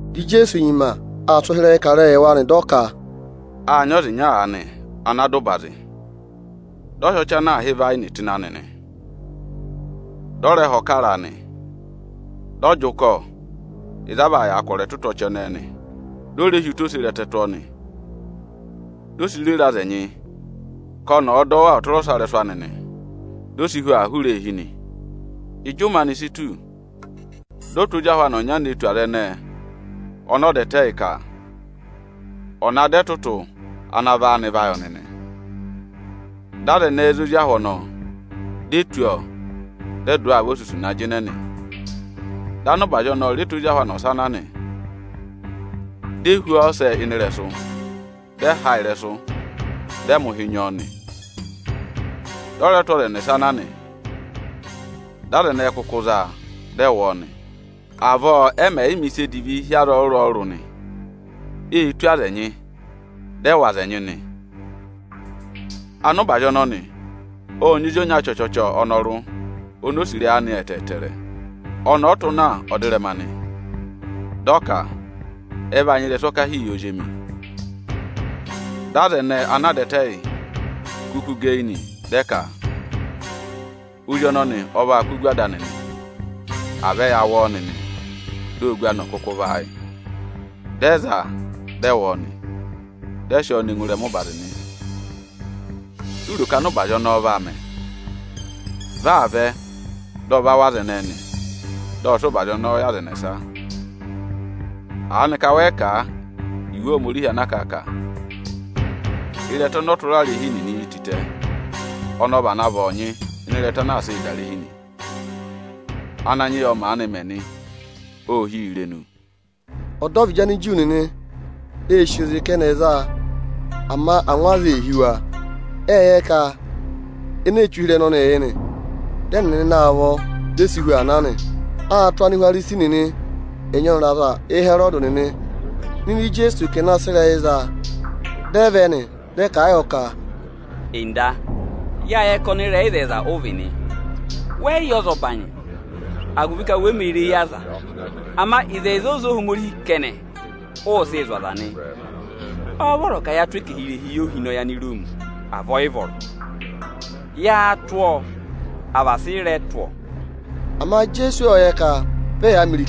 Dị Ijeesu nyima aa sị ụhịrẹyịị kà ịrẹyịị yị wa nị; dị ọ ka, “Â nyị ọza ịnya aanị ana dà ụbazị, dị ọ hị́ ọchị ana aā hị́ ịvayịnị tụ́ ịnị anị nị. Dị ọ rẹ họ̀ kara a nị. Ộ jị ụkọ ịzị a vaa yàa kwọrọ ẹtụtụ ọchị ẹnẹẹ, dị ọ re hi ụta oserẹtẹ tụ́ ọọ nị. Ộ sị ụbazị ọnọọ rere aza ẹnyị aanị ka ọnị ọ̀ọ dọ wa ọtụrọsarẹsụ anị. Di o si hu aa hụrẹ eehi nị. Ịjị ụmẹ anị si tù, dị ọ tụ́ ozi ahụ anị ọnya ne tù aza ẹnẹẹ ọnọọ dà ẹtẹ yị, ka ọ̀ na dọ ẹtụtụ ana vị áanị va yị ọnị nị. Dị aza ẹnẹẹ za ozi ahụ ọnọọ, di e tụ́ ọọ, dị ẹ dụ ọọ avosusu na jịnẹ nị. Dị ọza ana nyị ụbazị ọnọọ rẹ tụ́ ozi ahụ anị ọsa na nị. Di e hú ọọ ọsẹ ịnị ịrẹsụ, dị ẹ ha ịrẹsụ, dị ẹ mẹ̀ ụhị nyị ọọ nị. Dị ọ rẹ tụ́ ọza ẹnẹsa na nị; dị aza ẹnẹẹ kụkụ za a, dị ẹ wụ ọọ nị. Avọọ ẹ mẹ̀ yị mẹ, ịsa edivi hi aza ọrụrụ-ọrụrụ nị: Ê tụ́ aza ẹnyị, dị ẹ wụ̀ aza ẹnyị nị. Ọza ana nyị ụbazị ọnọnị ộ nyị ozi ọnya chọchọchọ̀ ọnọrụ oni o sì ịrẹyị anị ẹtẹẹtẹrẹ. Ọnị ọ tụ́ na ọdịrẹma nị, dị ọ ka: ‘Ẹ vaa nyị ịrẹsụ ọkahii yị ozi emi.’ Dị aza ẹnẹẹ ana a dà ẹtẹ yị, kụkụ gẹ eyi nị, dị ẹ ka: ‘Ozi ọnọnị ọ vaa kụ́ ogu ada anị nị; à vẹ ya wụ ọọ nịnị, di ogu anị ọ̀ kụkụ vị áayị!’ Dị ẹ za a, dị ẹ wụ ọọ nị; dị ẹ sị ọọ ne ngụ ịrẹma ụbazị nị. Si u ro ka ọza ana nyị ụbazị ọnọọ vaa mẹ? Vị aa vẹ, dị ọ va wụ̀ aza ẹnẹẹ nị; dị ọ sị ụbazị ọnọọ yị aza ẹnẹsa. Aanịka wẹ yị kà Iwe Ohomorihi ana kà a ka: ‘Ịrẹta ọnọ ọtụrarehi nịnị yi tịtẹ, ọnị ọ vana vị ọọnyị ịnị ịrẹta anaa sịị̄ dà irehi nị. Ananyị yị ọ maanị mẹ nị; ô hí yi irenu!’” Ọdọvịdị Aniju nịnị ê sì oze ka ẹnị ẹ̀ za a, ama angwa aza ee hí wa. Ệ yẹ ka eni ee che ụhịrẹyị ọnọọ yị nị. Dị ẹnịnị na a vọ, di e si hu aa na nị. Â tụ́ Anihwarisi nịnị ẹnyị ọnịrị aza Ịhẹrọdị nịnị nọ ịdị Ijeesu ka ẹ̀ na sị ịrẹyị za a. Dị ẹ vẹ nị, dị ẹ kà a yọ ka, “Nda, yâ yẹ ka ọnịrẹyịzẹyịza ụ vị nị. Wẹ yị yẹ ọzọbanyị, agụvị ka we mē re eyi aza. Ama ịzẹyịza oze Ohomorihi kẹnẹ, ụ sịị̄ zụ̀ aza nị. Ọ́ọ́ vọrọ ka yaa tụ́ ẹkẹhị irehi yị ohinọyị Aniroomi, à vị ọ yị vọrọ? Yáá tụ́ ọọ, à vị asị ị rẹ̀ tụ́ ọọ?” Ama Ijeesu ộ yẹ ka ọbọ ẹyaa mẹ nị.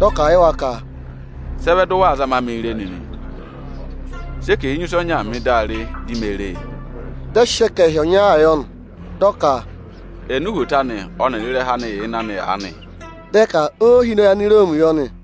Dị ọ kà a yị wa ka, “Sị ẹ vẹ dị ụ waa zama mịị re nịnị? Sị ẹkẹhị enyusẹ ọnyaa mị di a re di me re e!” Dị ẹ sị ẹkẹhị ọnyaa yọ nị. Dị ọ ka, “Ẹnị uhwoto anị ọnịrị ịrẹha anị yà ịnị anị aanị?” Dị ẹ ka óohinọnyị Aniroomi yọ nị.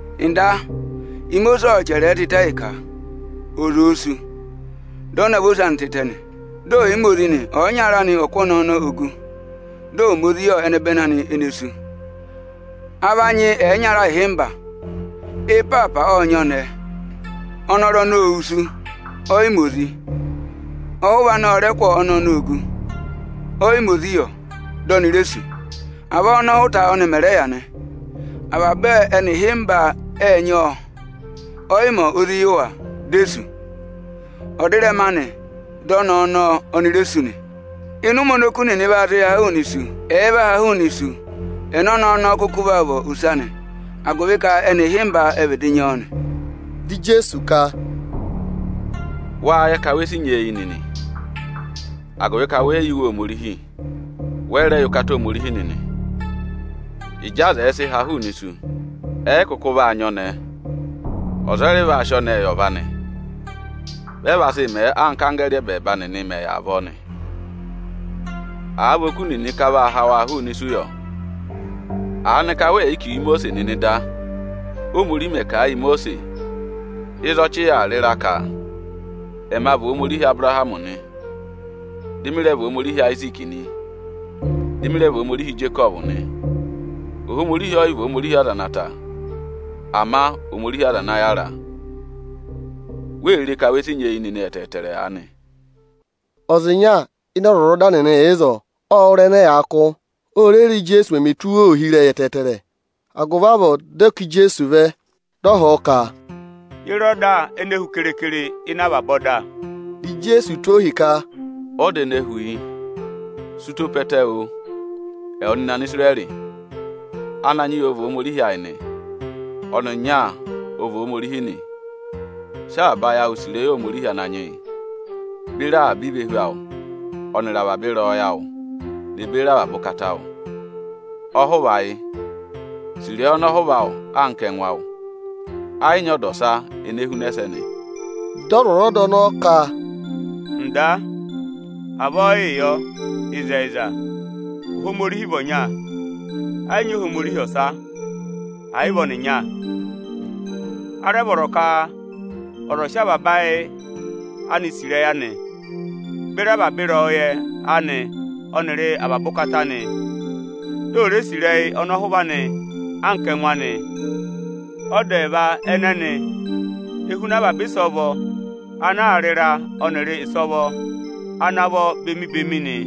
“Nda, Imosiisi ộ chẹrẹẹ tịtẹ yị ka, ọza òo sú, dị ọ navọ ose anị tịtẹ nị, dị ọ̀ yị ma ozi nị, ọyịnyara anị ọ̀ kụ́ ọnẹẹ ọnọọ ogu, dị ọ̀ ma ozi yị ẹnẹbẹnị anị ene sú. A va nyị ẹyịnyara ịhịmba. Ị́ịpaapa ộ nyị ọnẹẹ, ọnọrụ ọnọọ ô wusu, ọ yị ma ozi. Ọhụva anị ọ rẹ kụ́ ọnẹẹ ọnọọ ogu, ọ yị ma ozi yọ, di oni re sú. Avọọ ọ́nọhụta ọnị mẹ̀ rẹ yà nị. Avaba ẹnị ịhịmba ệ nyị ọọ, ọ yị ma ozi yị wa, di e sú. Ọdịrẹma anị dị ọnẹẹ ọnọọ oni re sú nị. Ịnị ụmẹ oni oku nịnị vaa sị haa hụụnị isu, ẹ̀ẹ vaa haa hụụnị isu, ẹnẹ ọnẹẹ ọnọọ kụkụ vaa vị ose anị agụvị ka ẹnị ịhịmba ẹ vịdị nyị ọọ nị.” Dị Ijeesu ka, “Wáá yẹ ka we si nyeeyi nịnị? Agụvị ka wẹ yị yẹ Iwe Ohomorihi, wẹ yị rẹ yẹ ụkata Ohomorihi nịnị. Ịjị aza ẹ̀ẹ sị ha hụụnị isu, ẹ yị kụkụ vaa nyị ọnẹẹ, ọza ọ yị rẹ va sị ọnẹẹ yị ọva anị. Vị ẹ vaa sị mẹẹ anka anggẹẹrị ẹ́bẹẹba nịnị mẹ̀ yà avọọ nị. Àa vị ka áá vaa ha oku nịnị hụụnị isu yọ, aanị ka wẹẹ̀ yị kà iwe Imosiisi nịnị da, Óhomorihi mẹ̀ kà a yị Imosiisi ịzị ọchị yà aa rị ịra ka: ‘Ẹma vị Ohomorihi Abụrahamị nị, dị mị rẹ vị Ohomorihi Ayiziiki nị, dị mị rẹ vị Ohomorihi Ijekọvụ nị.’ Ohomorihi ọ yị vị Ohomorihi aza ana ta, ama Ohomorihi aza ana yàra. Wee re ka we si nyeeyi nịnị ẹtẹẹtẹrẹ aanị.” Ọza ịnya ịnị ọzwọzọda nịnị yà ịzọọ. Ộ wụ́ ịrẹyị ẹnẹ ẹyaa kụ́; o re re, Íjeesu mẹmẹ tụ́ wa ohi ẹtẹẹtẹrẹ. Agụvị avọọ dị ọ ká Ijeesu vẹ, dị ọ họ̀ ọ ka, “Ye re ọda ene hu keekere ịnị avaba ọda?” Dị Ijeesu tụ́ ọọ ohi ka, “Ọda ene hu yị: ‘Sị ụtọ pe ẹtẹ oo, ẹwụ nịnị Anisirẹrị! Ananyị yị ọ vị Ohomorihi ayị nị. Ọnịnya ọ vị Ohomorihi nị. Sị avaba ayị awụ sì ịrẹyị Ohomorihi Ananyị yị, beri avaba ivehu awụ ọnịrị avaba ịrẹyọyẹ awụ ne beri avaba ụkata awụ!’ Ọhụva yị: ‘Sị ịrẹyị ọnọhụva awụ anka ẹngụ awụ!’ Ẹ yị nyị ọda ọsa ene huna ẹsẹnị.” Dị ọzwọzọda ọnọọ ka, “Nda, avọọ yịị yọ! Ịzẹyịza, Ohomorihi vị ọnya. Ẹ yị nyị Ohomorihi ọsa, ẹ̀ yị vị ọnịnya. A rẹ vọrọ ka ọza ọ̀ sị avaba ayị anị sì ịrẹyị anị, beri avaba ịrẹyọyẹ anị ọnịrị avaba ụkata anị, di ò re sì ịrẹyị ọnọhụva anị anka ẹngụ anị. Ọda ẹẹva ẹnẹnị e huna avaba ịsọvọ ana aā rị ịra ọnịrị ịsọvọ ana vọ bemi-bemi nị.”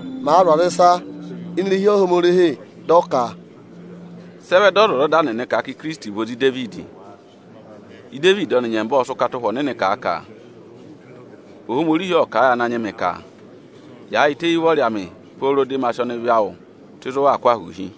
Íjeesu màa zụ̀ aza ịsa ini irehi Ohomorihi, dị ọ ka, “Sị ẹ vẹ dị ọzwọzọda nịnị kà a ka Ikirisiti vị ozi Idevidi? Idevidi ọnị nyẹmba ộ sị ụkata Ụhwẹ Ọnịnị kà a ka: ‘Ohomorihi ộ kà a yị Ananyị mị ka: Yaayịtẹ éyi ụvọrị amị pooro dị ma sị ọnịvị awụ tụ́ ịzị ụ waa kụ́ ahụụ hi!’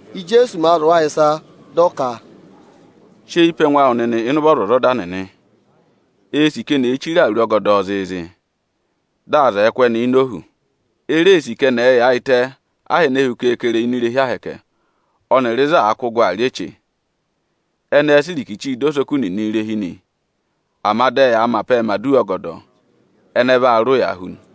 Íjeesu màa zụ̀ wa ịsa, dị ọ ka, “Sị eyi pe ẹngụ awụ nịnị ịnị ụvọ ọzwọzọda nịnị. Eē sì ka eni èe chire awuru ọgọdọọ zịịzị, dị aza ẹ̀ẹ kụ́ ẹnị ini ohu. E reē sì ka ẹnị ẹ̀ẹ yaayịtẹ aha ene hu keekere ini irehi Ohomorihi ọnịrị ịzị aa kụ́ gụ aa rị eche. Ẹnị ẹẹ̄ sị irikichii dọ osoku nịnị irehi nị; ama dị ẹyaa mẹ apẹẹ mẹ̀ aduwa ọgọdọ. Ẹnị ẹ vaa rị ụya hu nị.”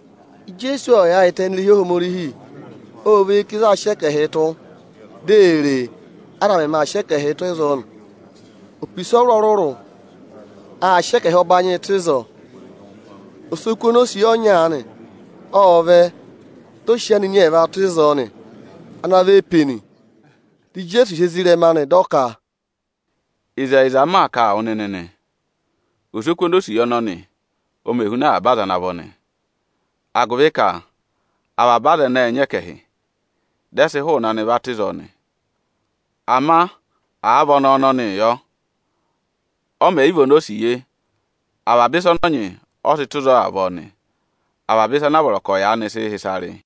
Ijeesu ộ yaayịtẹ ini irehi Ohomorihi, ộ và eyi ká ịzị aā sị ẹkẹhịị tụ́. Di ee re, aza mẹmẹ aa sị ẹkẹhịị tụ́ ịzọọ nị. Opisa ọrụrụ-ọrụrụ ệ sị ẹkẹhị ọbanyịị tụ́ ịzọọ. Osoku onosiye ọnya aanị ộ vẹ, dị ọ sị anini ẹẹva tụ́ ịzọọ nị. Anini ẹẹva vị eepeni. Dị Ijeesu hị́ ezirẹma anị, dị ọ ka, “Ịzẹyịza m maa kà a wụ nịnị nị, osoku onosiye ọnọnị ọ mẹ huna avaba aza ana vọ nị; agụvị ka avaba aza ana vọ ệ nyị ẹkẹhị, dị ẹ sị hụụnị anị va tụ́ ịzọọ nị. Ama àa vị ọnẹẹ ọnọnịị yọ, ọ mẹ̀ yị vị onosiye, avaba ịsa ọnị ọ nyị, ọ sị tụ́ ịzọọ avọọ nị, avaba ịsa ana vọrọ ka ọ̀ yaanị sị hị́ ịsa rị.”